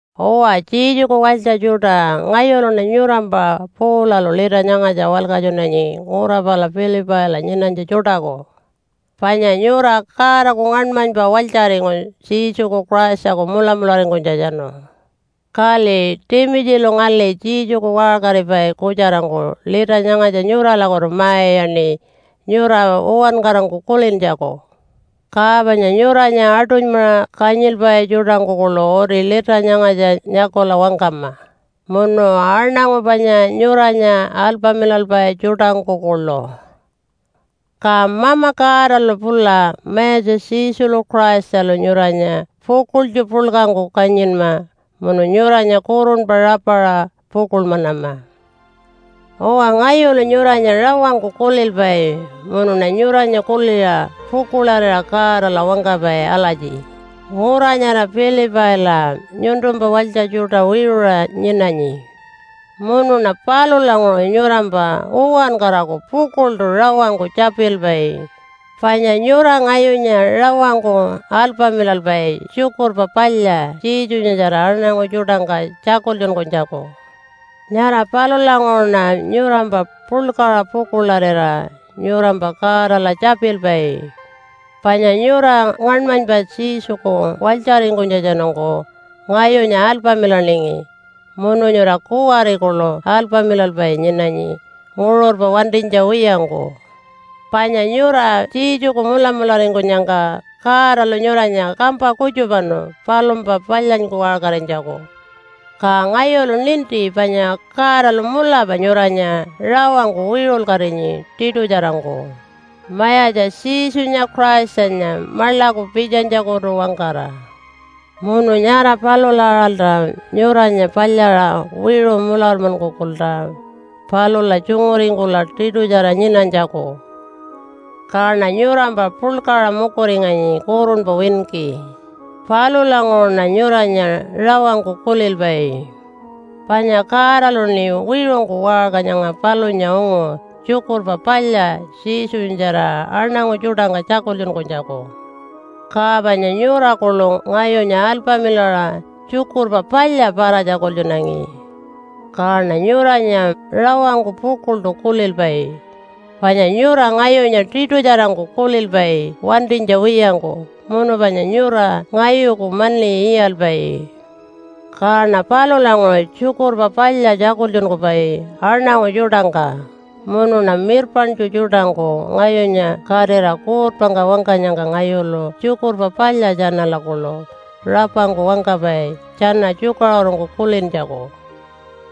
Uwa Jesuku walytja tjuṯa, ngayuluṉa nyurampa Paulalu lita nyangatja walkatjunanyi ngura pala Pilipaila nyinanytja tjuṯaku. Panya nyura Godaku ngaṉmanypa walytjaringu Jesuku Christaku mulamularingkunytjatjanu. Kali Timitjilu ngali Jesuku waṟkaripai kutjarangku lita nyangatja nyuralakutu ma-iyaṉi nyura uwankarangku kulintjaku. Ka panya nyuranya aṯunymaṟa kanyilpai tjuṯangku kuḻu uti lita nyangatja nyakula wangkama, munu aṉangu panya nyuranya alpamilalpai tjuṯangku kuḻu. Ka Mama Godalu pula Mayatja Jesulu Christalu nyuranya pukuḻtju puḻkangku kanyinma munu nyuranya kurunpa rapaṟa pukuḻmanama. Uwa, ngayulu nyuranya rawangku kulilpai munuṉa nyuranya kuliṟa pukuḻarira Godala wangkapai alatji, “Ngura nyara Pilipaila nyuntumpa walytja tjuṯa wiṟuṟa nyinanyi.” Munuṉa palulanguṟu nyurampa uwankaraku pukuḻṯu rawangku tjapilpai, panya nyura ngayunya rawangku alpamilalpai Tjukurpa Palya Jesunyatjara aṉangu tjuṯangka tjakultjunkunytjaku. Nyara palulanguṟuṉa nyurampa puḻkaṟa pukuḻarira nyurampa Godala tjapilpai. Panya nyura ngaṉmanypa Jesuku walytjaringkunytjatjanungku ngayunya alpamilaningi munu nyura kuwari kuḻu alpamilalpai nyinanyi nguṟurpa wantinytja wiyangku. Panya nyura Jesuku mulamularingkunyangka Godalu nyuranya kampa kutjupanu palumpa palyanyku waṟkarinytjaku. Ka ngayulu ninti panya Godalu mulapa nyuranya rawangku wiṟulkatinyi tiṯutjarangku, Mayatja Jesunya Christanya maḻaku pitjanytjakutu-wangkara. Munu nyara palula aṟalta nyuranya palyaṟa wiṟu mularmankukulta palula tjunguringkula tiṯutjara nyinanytjaku. Kaṉa nyurampa puḻkaṟa mukuringanyi kurunpa winki. Palulanguṟuṉa nyuranya rawangku kulilpai. Panya Godaluṉi wiṟungku waṟka nyanga palunya ungu Tjukurpa Palya Jesunyatjara aṉangu tjuṯangka tjakultjunkunytjaku. Ka panya nyura kuḻu ngayunya alpamilaṟa Tjukurpa Palya para-tjakultjunangi. Kaṉa nyuranya rawangku pukuḻṯu kulilpai, panya nyura ngayunya tiṯutjarangku kulilpai wantinytja wiyangku munu panya nyura ngayuku mani iyalpai. Kaṉa palulanguṟu Tjukurpa Palya tjakultjunkupai aṉangu tjuṯangka, munuṉa mirpaṉtju tjuṯangku ngayunya katira kuutpangka wangkanyangka ngayulu Tjukurpa Palya tjanala kuḻu rapangku wangkapai tjana tjukaṟurungku kulintjaku.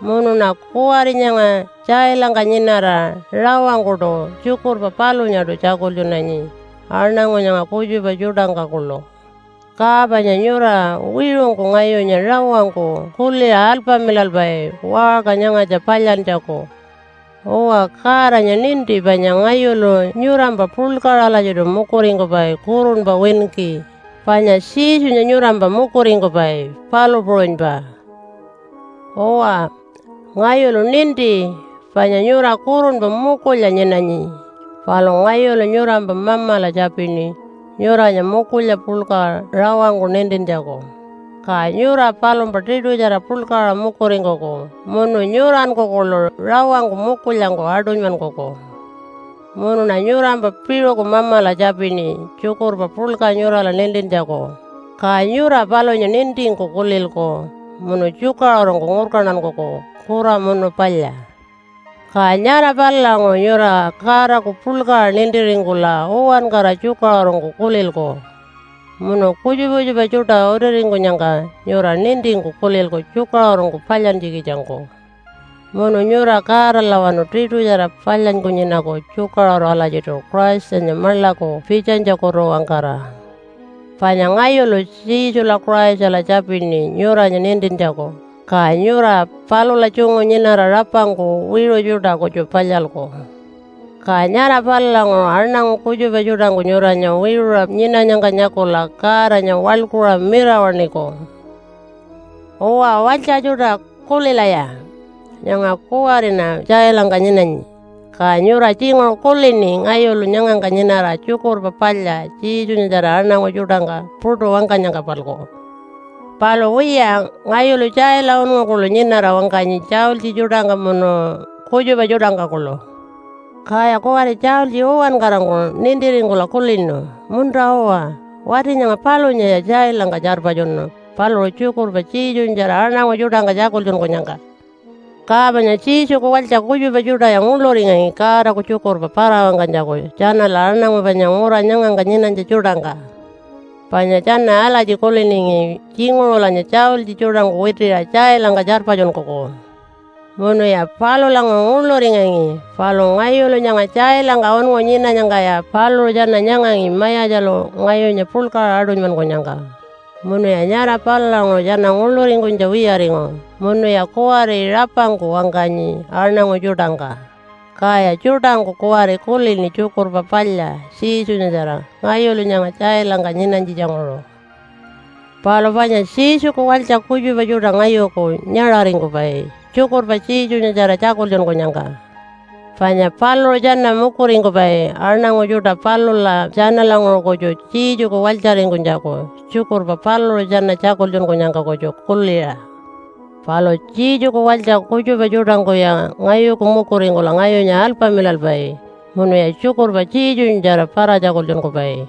Munuṉa kuwari nyanga tjailangka nyinara rawangkuṯu tjukurpa palunyaṯu tjakultjunanyi aṉangu nyanga kutjupa tjuṯangka kuḻu. Ka panya nyura wiṟungku ngayunya rawangku kuliṟa alpamilalpai waṟka nyangatja palyantjaku. Uwa, Godanya ninti panya ngayulu nyurampa puḻkaṟa alatjiṯu mukuringkupai kurunpa winki, panya Jesunya nyurampa mukuringkupai, palu puṟunypa. Uwa, ngayulu ninti panya nyura kurunpa mukulya nyinanyi, palu ngayulu nyurampa Mamala tjapini nyuranya mukulya puḻka rawangku nintintjaku, ka nyura palumpa tiṯutjara puḻkaṟa mukuringkuku munu nyuranku kuḻu rawangku mukulyangku aṯunymankuku. Munuṉa nyurampa piṟuku Mamala tjapini tjukurpa puḻka nyurala nintintjaku, ka nyura palunya nintingku kulilku munu tjukaṟurungku ngurkantankuku kura munu palya. Ka nyara palulanguṟu nyura Godaku puḻkaṟa nintiringkula uwankara tjukaṟurungku kulilku. Munu kutjupa kutjupa tjuṯa utiringkunyangka nyura nintingku kulilku tjukaṟurungku palyantjikitjangku. Munu nyura Godalawanu tiṯutjara palyanyku nyinaku tjukaṟuru alatjiṯu Christanya maḻaku pitjanytjakutu-wangkara. Panya ngayulu Jesula Christala tjapini nyuranya nintintjaku, ka nyura palula tjungu nyinara rapangku wiṟu tjuṯa kutju palyalku. Ka nyara palulanguṟu aṉangu kutjupa tjuṯangku nyuranya wiṟuṟa nyinanyangka nyakula Godanya waḻkuṟa mirawaṉiku. Uwa, walytja tjuṯa, kulilaya! Nyanga kuwariṉa tjailangka nyinanyi, ka nyura tjinguṟu kulini ngayulu nyangangka nyinara Tjukurpa Palya Jesunyatjara aṉangu tjuṯangka puṯu wangkanyangka-palku. Palu wiya, ngayulu tjaila unngu kuḻu nyinara wangkanyi tjaultji tjuṯangka munu kutjupa tjuṯangka kuḻu. Kaya kuwari tjaultji uwankarangku nintiringkula kulinu, “Munta-uwa, wati nyanga palunyaya tjailangka tjarpatjunu paluṟu tjukurpa Jesunyatjara aṉangu tjuṯangka tjakultjunkunyangka.” Ka panya Jesuku walytja kutjupa tjuṯaya nguḻuringangi Godaku tjukurpa para-wangkanytjaku tjanala aṉangu panya ngura nyangangka nyinanytja tjuṯangka. Panya tjana alatji kuliningi, “Tjinguṟulanya tjaultji tjuṯangku witiṟa tjailangka tjarpatjunkuku.” Munuya palulanguṟu nguḻuringangi. Palu ngayulu nyanga tjailangka unngu nyinanyangkaya paluṟu tjana nyangangi Mayatjalu ngayunya puḻkaṟa aṯunymankunyangka, munuya nyara palulanguṟu tjana nguḻuringkunytja wiyaringu, munuya kuwari rapangku wangkanyi aṉangu tjuṯangka, kaya tjuṯangku kuwari kulini Tjukurpa Palya Jesunyatjara ngayulu nyanga tjailangka nyinanytjitjanguṟu. Palu panya Jesuku walytja kutjupa tjuṯa ngayuku nyaṟaringkupai tjukurpa Jesunyatjara tjakultjunkunyangka. Panya paluṟu tjana mukuringkupai aṉangu tjuṯa palula tjanalanguṟu kutju Jesuku walytjaringkunytjaku, tjukurpa paluṟu tjana tjakultjunkunyangka kutju kuliṟa. Palu Jesuku walytja kutjupa tjuṯangkuya ngayuku mukuringkula ngayunya alpamilalpai munuya tjukurpa Jesunyatjara para-tjakultjunkupai.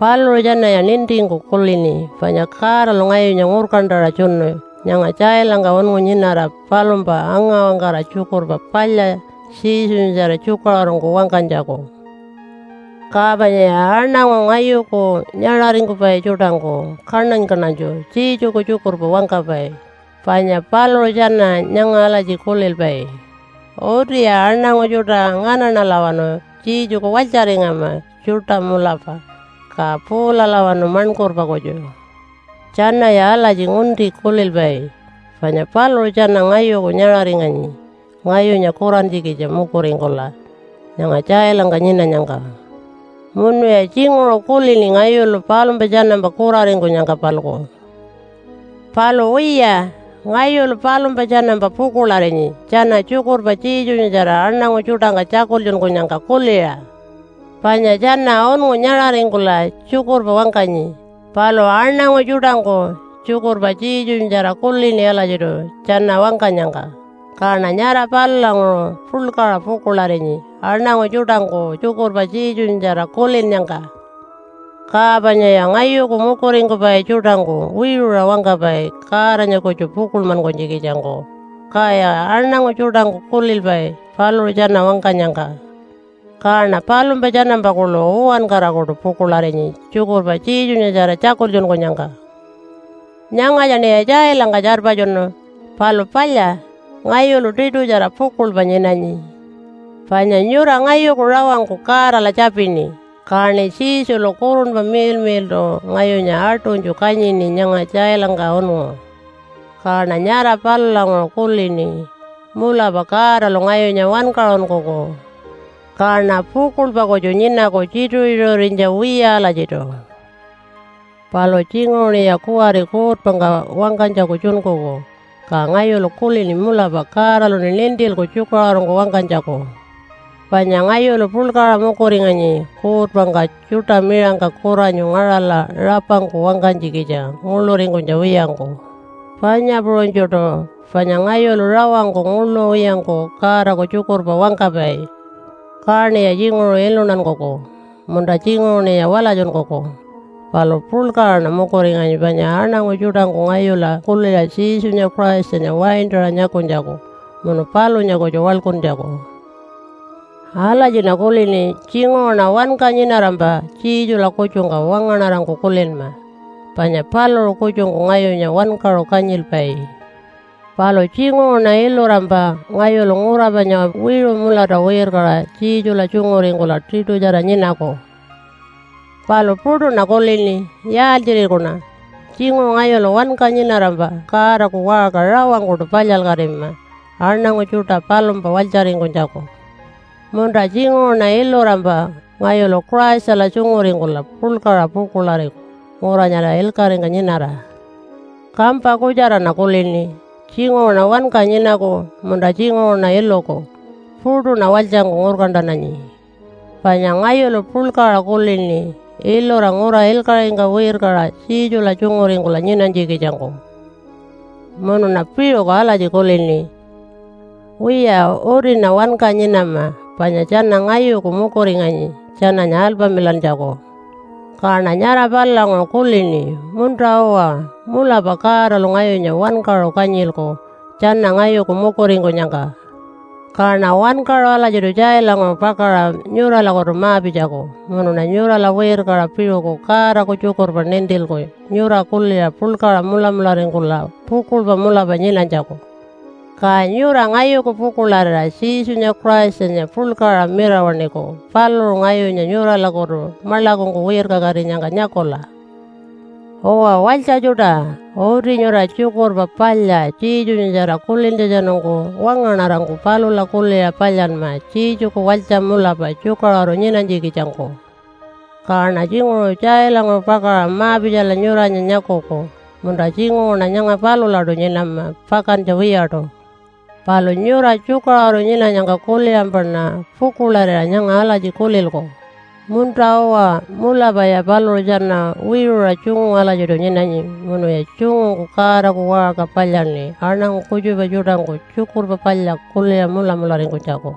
Paluṟu tjanaya nintingku kulini panya Godalu ngayunya ngurkantaṟa tjunu nyanga tjailangka ungu nyinara palumpa anga-wangkara Tjukurpa Palya Jesunyatjara tjukaṟurungku wangkanytjaku. Ka panyaya aṉangu ngayuku nyaṟaringkupai tjuṯangku kaṉany-kaṉanytju Jesuku tjukurpa wangkapai, panya paluṟu tjana nyanga alatji kulilpai, “Utiya aṉangu tjuṯa nganaṉalawanu Jesuku walytjaringama tjuṯa mulapa, ka Paulalawanu maṉkurpa kutju.” Tjanaya alatji ngunti kulilpai, panya paluṟu tjana ngayuku nyaṟaringanyi ngayunya kurantjikitja mukuringkula nyanga tjailangka nyinanyangka. Munuya tjinguṟu kulini ngayulu palumpa tjanampa kuraringkunyangka-palku. Palu wiya, ngayulu palumpa tjanampa pukuḻarinyi tjana tjukurpa Jesunyatjara aṉangu tjuṯangka tjakultjunkunyangka kuliṟa. Panya tjana unngu nyaṟaringkula tjukurpa wangkanyi, palu aṉangu tjuṯangku tjukurpa Jesunyatjara kulini alatjiṯu tjana wangkanyangka, kaṉa nyara palulanguṟu puḻkaṟa pukuḻarinyi aṉangu tjuṯangku tjukurpa Jesunyatjara kulinnyangka. Ka panyaya ngayuku mukuringkupai tjuṯangku wiṟuṟa wangkapai Godanya kutju pukuḻmankunytjikitjangku, kaya aṉangu tjuṯangku kulilpai paluṟu tjana wangkanyangka. Kaṉa palumpa tjanampa kuḻu uwankarakuṯu pukuḻarinyi tjukurpa Jesunyatjara tjakultjunkunyangka. Nyangatjaṉiya tjailangka tjarpatjunu, palu palya, ngayulu tiṯutjara pukuḻpa nyinanyi. Panya nyura ngayuku rawangku Godala tjapini, kaṉi Jesulu Kurunpa Miḻmiḻṯu ngayunya aṯunytju kanyini nyanga tjailangka unngu. Kaṉa nyara palulanguṟu kulini, “Mulapa Godalu ngayunya wankaṟunkuku.” Kaṉa pukuḻpa kutju nyinaku tjituṟu-tjituṟurinytja wiya alatjiṯu. Palu tjinguṟuṉiya kuwari kuutpangka wangkanytjaku tjunkuku, ka ngayulu kulini mulapa Godaluṉi nintilku tjukaṟurungku wangkanytjaku. Panya ngayulu puḻkaṟa mukuringanyi kuutpangka tjuṯa miṟangka kuranyu ngaṟala rapangku wangkanytjikitja nguḻuringkunytja wiyangku, panya puṟunytjuṯu, panya ngayulu rawangku nguḻu wiyangku Godaku tjukurpa wangkapai. Kaṉiya tjinguṟu iluntankuku, munta tjinguṟuṉiya walatjunkuku. Palu puḻkaṟaṉa mukuringanyi panya aṉangu tjuṯangku ngayula kuliṟa Jesunya Christanya waintaṟa nyakunytjaku munu palunya kutju waḻkuntjaku. Alatjiṉa kulini. Tjinguṟuṉa wanka nyinarampa Jesula kutjungka wangaṉarangku kulinma panya paluṟu kutjungku ngayunya wankaṟu kanyilpai. Palu tjinguṟuṉa ilurampa ngayulu ngura panya wiṟu mulata wirkaṟa Jesula tjunguringkula tiṯutjara nyinaku. Palu puṯuṉa kulini. Yaaltjirikuṉa? Tjinguṟu ngayulu wanka nyinarampa Godaku waṟka rawangkuṯu palyalkatima aṉangu tjuṯa palumpa walytjaringkunytjaku. Munta tjinguṟuṉa ilurampa ngayulu Christala tjunguringkula puḻkaṟa pukuḻariku ngura nyara ilkaṟingka nyinara. Kampa kutjaraṉa kulini, tjinguṟuṉa wanka nyinaku, munta tjinguṟuṉa iluku. Puṯuṉa walytjangku ngurkantananyi. Panya ngayulu puḻkaṟa kulini ilura ngura ilkaṟingka wirkaṟa Jesula tjunguringkula nyinanytjikitjangku. Munuṉa piṟuku alatji kulini, “Wiya, utiṉa wanka nyinama panya tjana ngayuku mukuringanyi tjananya alpamilantjaku.” Kaṉa nyara palulanguṟu kulini, “Munta-uwa, mulapa Godalu ngayunya wankaṟu kanyilku tjana ngayuku mukuringkunyangka.” Kaṉa wankaṟu alatjiṯu tjailanguṟu pakaṟa nyuralakutu ma-pitjaku munuṉa nyurala wirkaṟa piṟuku Godaku tjukurpa nintilku nyura kuliṟa puḻkaṟa mulamularingkula pukuḻpa mulapa nyinanytjaku. Ka nyura ngayuku pukuḻarira Jesunya Christanya puḻkaṟa mirawaṉiku paluṟu ngayunya nyuralakutu maḻakungku wirkakatinyangka nyakula. Uwa, walytja tjuṯa! Uti nyura Tjukurpa Palya Jesunyatjara kulintjatjanungku wangaṉarangku palula kuliṟa palyanma Jesuku walytja mulapa tjukaṟuru nyinanytjikitjangku. Kaṉa tjinguṟu tjailanguṟu pakaṟa ma-pitjala nyuranya nyakuku, munta tjinguṟuṉa nyanga palulaṯu nyinama pakantja wiyaṯu. Palu nyura tjukaṟuru nyinanyangka kuliṟampaṉa pukuḻarira nyanga alatji kulilku, “Munta-uwa mulapaya paluṟu tjana wiṟuṟa tjungu alatjiṯu nyinanyi munuya tjungungku Godaku waṟka palyaṉi aṉangu kutjupa tjuṯangku Tjukurpa Palya kuliṟa mulamularingkunytjaku.”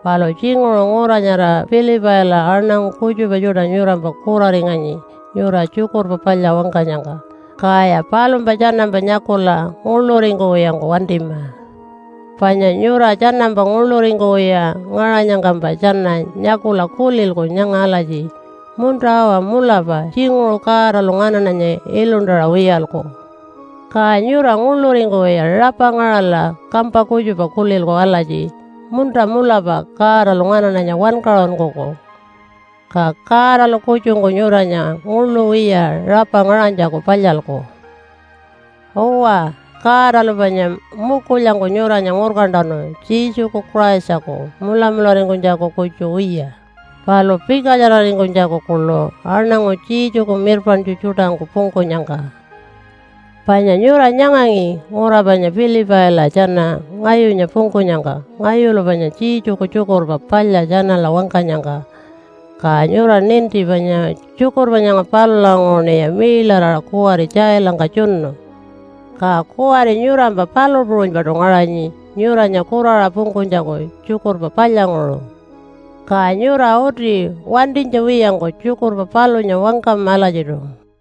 Palu tjinguṟu ngura nyara Pilipaila aṉangu kutjupa tjuṯa nyurampa kuraringanyi nyura Tjukurpa Palya wangkanyangka. Kaya palumpa tjanampa nyakula nguḻuringkuwiyangku wantima. Panya nyura tjanampa nguḻuringkuwiya ngaṟanyangkampa tjana nyakula kulilku nyanga alatji, “Munta-uwa, mulapa tjinguṟu Godalu nganaṉanya iluntaṟa wiyalku.” Ka nyura nguḻuringkuwiya rapa ngaṟala kampa kutjupa kulilku alatji, “Munta, mulapa Godalu nganaṉanya wankaṟunkuku.” Ka Godalu kutjungku nyuranya nguḻu wiya rapa ngaṟanytjaku palyalku. Uwa, Godalu panya mukulyangku nyuranya ngurkantanu Jesuku Christaku mulamularingkunytjaku kutju wiya palu pikatjararingkunytjaku kuḻu aṉangu Jesuku mirpaṉtju tjuṯangku pungkunyangka. Panya nyura nyangangi ngura panya Pilipaila tjana ngayunya pungkunyangka ngayulu panya Jesuku Tjukurpa Palya tjanala wangkanyangka. Ka nyura ninti panya tjukurpa nyanga palulanguṟuṉiya miiḻaraṟa kuwari tjailangka tjunu. Ka kuwari nyurampa palu puṟunypaṯu ngaṟanyi nyuranya kuraṟa pungkunytjaku Tjukurpa Palyanguṟu. Ka nyura uti wantinytja wiyangku tjukurpa palunya wangkama alatjiṯu.